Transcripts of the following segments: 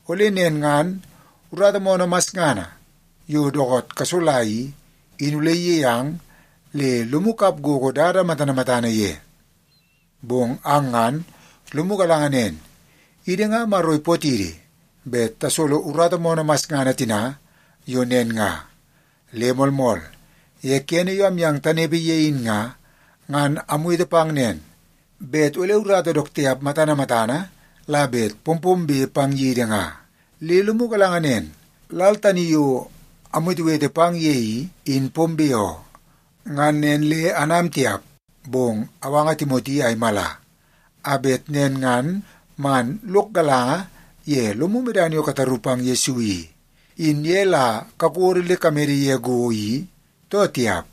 Ole nen ngan urata moonoo masngana yo dookoot kasola i, in ole iyei ang le lomu kap gogo dada matana matana ye. Bong ang ngan lomu galanga nen, idi nga Maro ipootidi bet tasolo urata moonoo masngana tina yo nen nga. Le moolmool, ye kene yo amyang tanepe ye in nga, ngan amwete pang nen, bet ole urata dook tiap matana matana la bet pompombe pang yidi nga. Le lomu galanga nen, lal tani yo amwetewete pang ye i, in pombe oo. Ngan nen le anam tiap. Bong awanga Timoti a imala, a bet nen ngan man lok galanga ye lomu medana yo kataru pang Yesu i, in ye la kakodo le kamede ye go i, too tiap.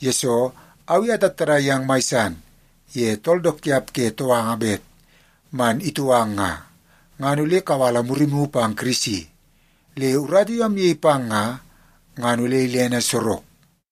Yesoo au i atattadai yang mai san ye tool dook tiap ke touanga bet man itou ang nga, ngan ole kawala murimu pang Kirisi, le urata yo amyei pang nga, ngan ole ilene sorok.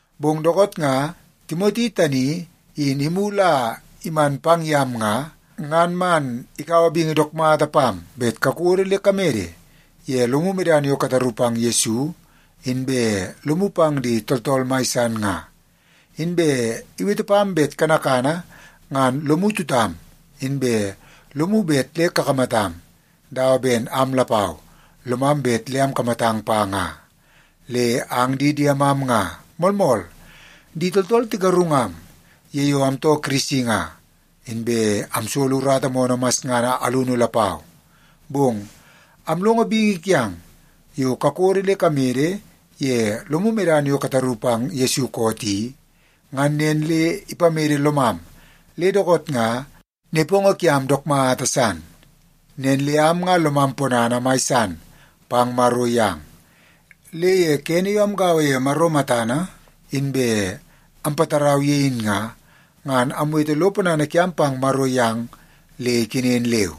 Bong dookoot nga Timoti tani in imulu a iman pang yam nga, ngan man ikaua bingi dook mata pam bet kakodo le kamede ye lomu medana yo kataru pang Yesu inbe lomu pang di tooltool mai san nga. Inbe iwete pam bet kanakana ngan lomu tutam, inbe lomu bet le kakamatam, dawa ben am lapau, lomam bet le akamatang pa nga. Le ang di diemam nga, moolmool, di tooltool tigarungam ye yo amtoo Kirisi nga, inbe amsolo urata moonoo masngana alunu lapau. Bong amlongo bingi kiang yo kakodo le kamede ye lomu medana yo kataru pang Yesu koot i, ngan nen le ipamede lomam le dookoot nga nepongo kiam dook mata san. Nen le am nga lomam ponana mai san pang Maro yang. Le ye kene yo amgaua ye Maro matana inbe ampatarau ye in nga, ngan amwete lo ponana kiam pang Maro yang le ikenen leu.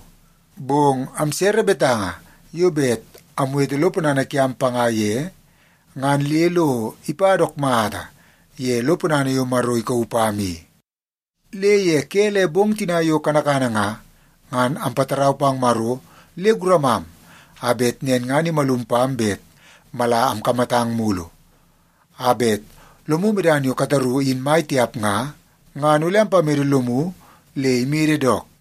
Bong amsere betanga yo bet amwete lo ponana kiam panga ye, ngan le lo ipa dook mata ye lo ponana yo Maro ikauu pam i. Le ye ke le bong tina yo kanakana nga, ngan ampatarau pang Maro le guramam, a bet nen ngan imalum pam bet mala amkamatang mulu, a bet lomu medana yo kataru in mai tiap nga, ngan ole ampamede lomu le imede dook.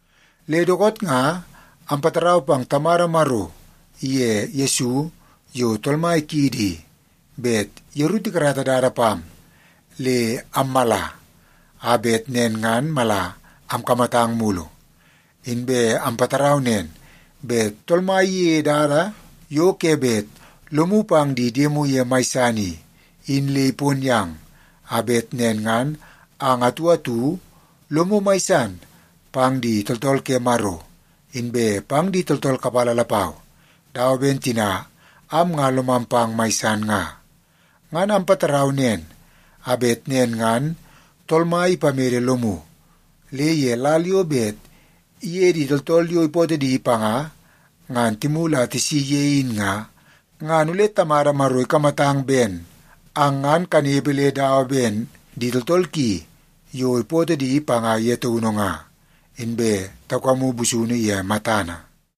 Le dookoot nga ampatarau pang Tamada Maro iye Yesu yo Tool Mai kiidi i, bet yeru tikarata dada pam le ammala a bet nen ngan mala amkamatang mulu. Inbe ampatarau nen, bet Tool Mai iyeie dada yo ke bet lomu pang di diemu ye mai san i, in le ipon yang, a bet nen ngan ang atu atu lomu mai san pang di tooltool ke Maro, inbe pang di tooltool kapala lapau, dawa ben tina am nga lomam pang mai san nga. Ngan ampatarau nen a bet nen ngan Tool Mai ipamede lomu, le ye lal yo bet iye di tooltool yo ipootoo di panga, ngan timulu a tisi ye in nga, ngan ole Tamada Maro ikamatang ben ang ngan kanepe le dawa ben di tooltool ki yo ipootoo di panga ye taunu nga, inbe taukamu busunu ye matana.